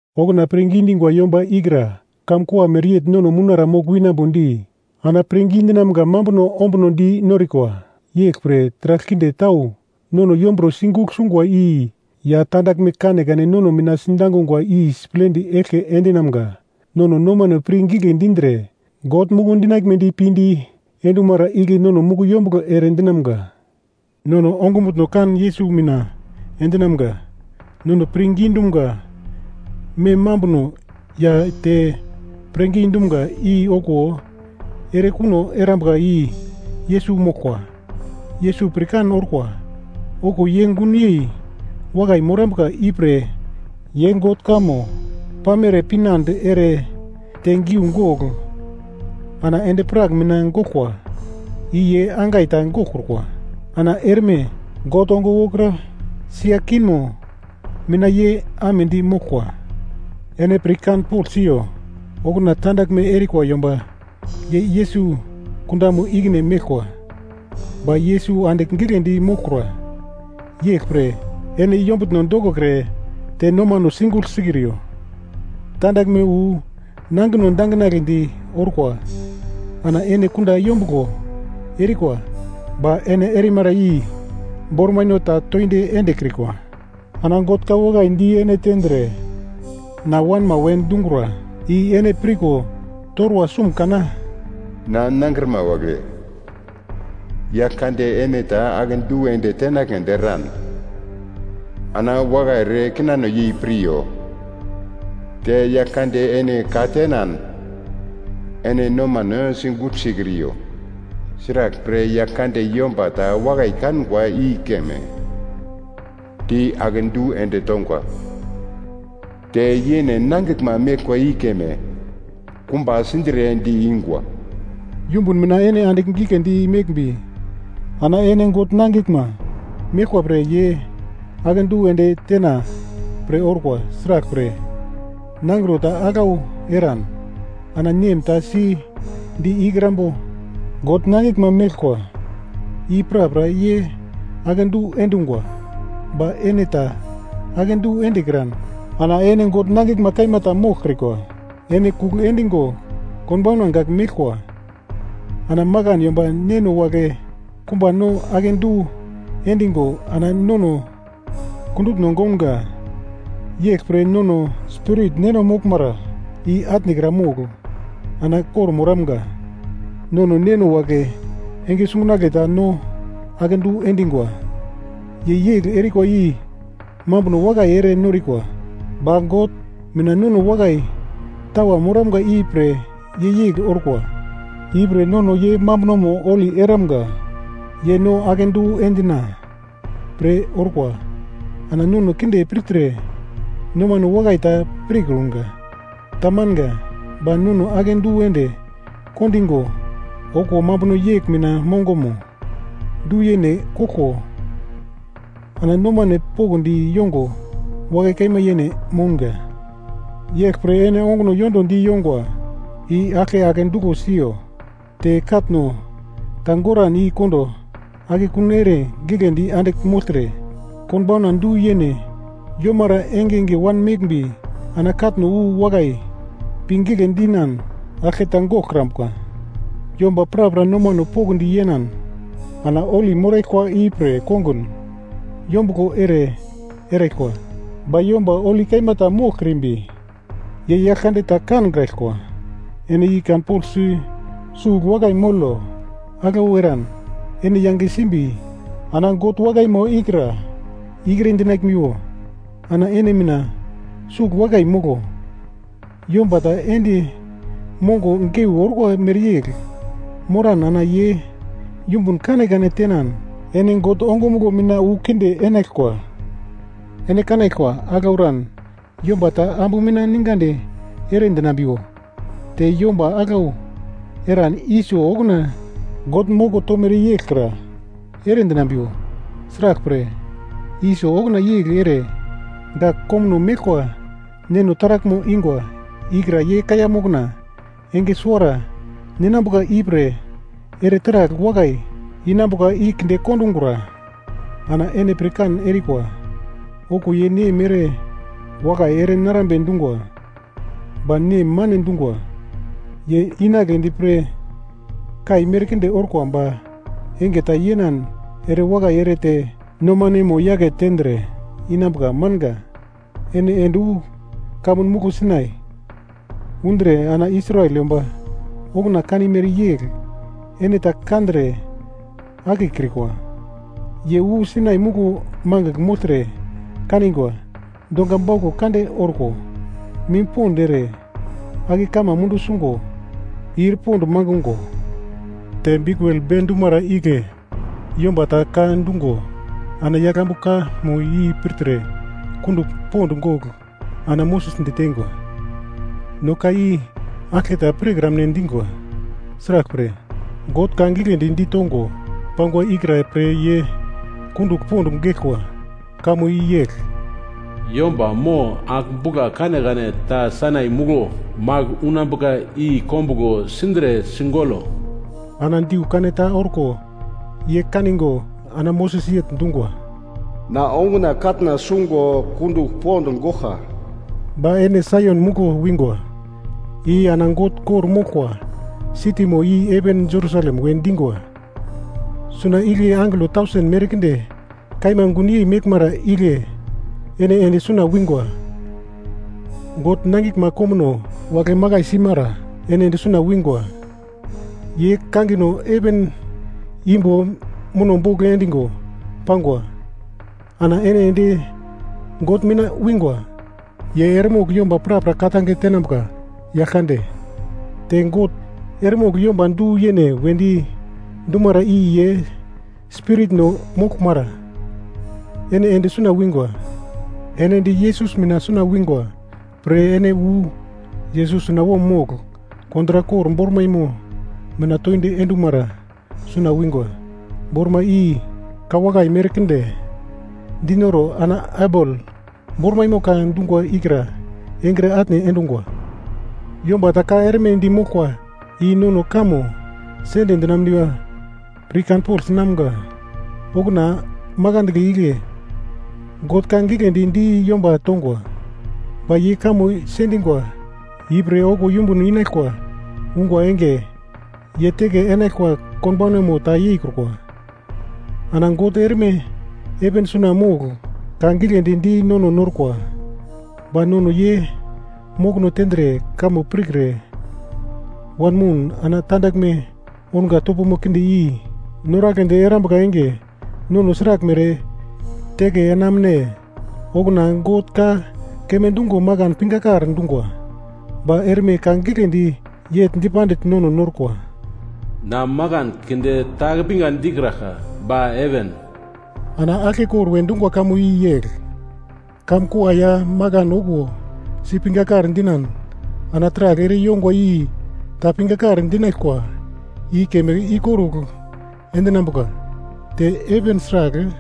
Okuna pirngi dingwa yomba ikra kamkua mereyegl nono mounara mogl winambodi ana pirngi dinamga mambuno ombuno di norikwa, yeglpre taragl kinde tau nono yomburo sigugl sungwa i ya tandaglme kanekane nono mina sidangungwa i siplendi eglke endinamga. Nono nomano pir gigle dindre God muku dinaglmedi pinde endumara igle nono muku yombuglo ere dinamga. Nono ongumutno kan Yesus mina endinamga, nono pirngi dumga mem mambuno ya te pirngi dumga i okuwo erekuno erambuka i Yesus moglkwa. Yesus pirkan orkwa okuwo ye gunyei wakai morambuka ipre ye God kamo pamere pinande ere te giugogl ana endi-prak mina goglkwa i ye angai ta goglkrukwa. Ana erme God ongo wokra sia kingmo mina ye amedi moglkwa. Ene pirkanpogl siyo, okuna tandaglme erikwa yomba ye Yesus kundamo ikine meglkwa, ba Yesus andigl giglendi moglkura. Yeglpre ene yombtno dokokre te nomano sigugl sikriyo. Tandaglme wu nangino danginagledi orko ana ene kunda yombuglo erikwa ba ene erimara i bormaino ta toindi endekrikwa. Ana God ka wakai di ene tendre na wanma we dungra i ene pirko torwa sum kana? “Na nangrima wagle, Yaglkande ene ta akedu ende tenagledi eran ana wakai ere kinano yei piryo, te Yaglkande ene ka tenan ene nomano sigugl sikriyo. Sraglpre, Yaglkande yomba ta wakai kangwa i keme di akedu ende tongwa, te yene nangiglma meglkwa i keme kumba sindre di-ingwa.” Yumbun mina ene andigl giglendi meglmbi ana ene God nangiglma meglkwa pre ye akedu ende tena pre orkwa, sraglpre, nangro ta aglau eran ana nem ta si di ikrambo? God nangiglma meglkwa i prapra ye akedu endungwa, ba ene ta akedu endekran ana ene God nangiglma kaima ta moglkrikwa, ene kugl endigo konbauna gak meglkwa. Ana makan yomba neno wagle kumba no akedu endigo ana nono kundutno gounga. Yeglpre nono spirit Neno moglmara i atnekra mogl ana kor-moramga. Nono neno wagle enge sungunagle ta no akedu endingwa. Ye yegl erikwa i mambuno wakai ere norikwa. Ba God mina nono wakai tawa moramga i pre ye yegl orkwa, ipre nono ye mambunomo holi eramga. Ye no akedu endina pre orkwa ana nono kinde pirtre nomano wakai ta pirkunga. Tamanga. Ba no akedu ende kondingo okuwo mambuno yegl mina mongomo du-yene koglko ana nomane pokndi yongo wakai kaima yene mounga. Yeglpre ene onguno yondodi yongwa i aglke ake duglo siyo, te katno ta goran i kondo akekun ere giglendi andigl mogltre, konbauna du-yene yomara engenge wanmeglmbi ana katno wu wakai pi gigle dinan aglketa goglkrambuka. Yomba prapra nomano pokndi yenan ana holi moraglkwa ipre kongun yombuglo ere eraglkwa, ba yomba holi kaima ta moglkrimbi ye Yaglkande ta kankraglkwa. Ene i kanpoglsi sugl wakai molo, aglau eran ene yange simbi ana God wakaimo ikra ikre dinaglmiwo. Ana ene mina sugl wakai molo, yomba ta endi mongo geu orkwa mereyegl moran ana ye yumbun kanekane tenan ene God ongumuglo mina wu kinde enaglkwa. Ene kanaglkwa, aglau eran yomba ta ambu mina ningadi ere dinambiwo, te yomba aglau eran Iso okuna God moko tomere yeglkra eredinambiwo. Sraglpre Iso okuna yegl ere gak komuno meglkwa neno taraglmo ingwa ikra ye kaiya mokna enge suwara ninambuka ipre ere taragl wakai inambuka i kinde kondungra. Ana ene pirkan erikwa, okuwo ye nem ere wakai ere narambe dungwa ba nem mane dungwa. Ye inagledi pre kai merkinde orkwa ba enge ta yenan ere wakai ere te nomanemo yake tendre inambuka manga. Ene ende wu kamun muglo Sainai undre ana Israel yomba okuna kanimere yegl ene ta kandre akekrikwa. Ye wu Sainai muglo magl mogltre kaningwa, dongwa bauglo kande orko, mim pond ere ake kama mundu sungo, ir pond mangungo, te biukul bedumara igle yomba ta ka dungo ana yaglambu kamo i pirtre kundugl pond gogl ana Moses diteingwa, “No ka i aglketa pirkramne dingwa.” Sraglpre, God ka giglendi ditongo pangwa ikra pre ye kundugl pond geglkwa, kamo i yegl, “Yomba mo agl-bugla kanekane ta Sainai muglo magl unambuka i kombuglo sindre sigolo.” Ana diu kaneta orko ye kanigo ana Moses yegl dungwa, “Na onguna katna sungo kundugl pond goglka.” Ba ene Saion muglo wingwa i ana God kor-moglkwa sitimo i heven Jerusalem we dingwa, suna igle angelo tausen merkinde kaima gunyei meglmara igle ene ende suna wingwa. God nangiglma komuno wagle makai simara ene ende suna wingwa, ye kangino heven imbo muno bogl endungo pangwa. Ana ene ende God mina wingwa. Ye eremogl yomba prapra ka-tange tenambuka Yaglkande. Te God eremogl yomba du-yene wedi dumara i ye spiritno moglmara, ene ende suna wingwa. Ene ende Yesus mina wingwa pre, ene wu Yesus sunawom mogl kontrak kor bormaimo mina toindi endumara suna wingwa. Bormai i ka wakai merkinde dinoro ana Abel bormaimo ka dungwa ikra engre atne endungwa. Yomba ta ka erme di moglkwa i nono kamo sende dinamuniwa pirkanpogl sinamga. Okuna makandle igle God ka giglendi di yomba tongwa, ba ye kamo sendingwa ipre okuwo yumbun inaglkwa ungwa enge ye teke enaglkwa konbaunamo ta yeikrukwa. Ana God erme heven suna mogl ka giglendi di nono norkwa, ba nono ye mokono tendre kamo pirkre wanmoun ana tandaglme ounga topomo kinde i noragledi erambuka enge nono sraglmere teke enamune? Okuna God ka keme dungo makan pingakar dungwa. Ba erme ka giglendi yegl dipandigl nono norkwa, “Na makan keunde ta ake pinga dikraglka ba heven.” Ana aglkekor we dungwa kamo i yegl, kamkua ya makan okuwo si pingakar dinan ana taragl ere yongwa i ta pingakar dinaglkwa i keme ikorugl endinambuka, te heven sragl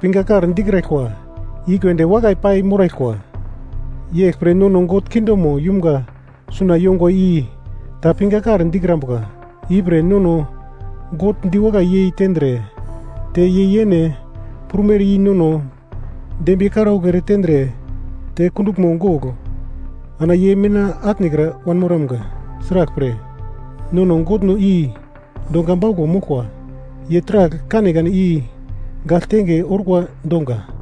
pingakar dikraglkwa i keunde wakai pai moraglkwa. Yeglpre nono God kingdomo yumga suna yongwa i ta pingakar dikrambuka. Ipre nono God diwakai yei tendre te ye yene prumere i nono dembiye karaugl ere tendre te kunduglmo gogl, ana ye mina atnekra wanmoramga. Sraglpre, nono Godno i donga bauglo moglkwa ye taragl kanekane i gagl tenge orkwa donga.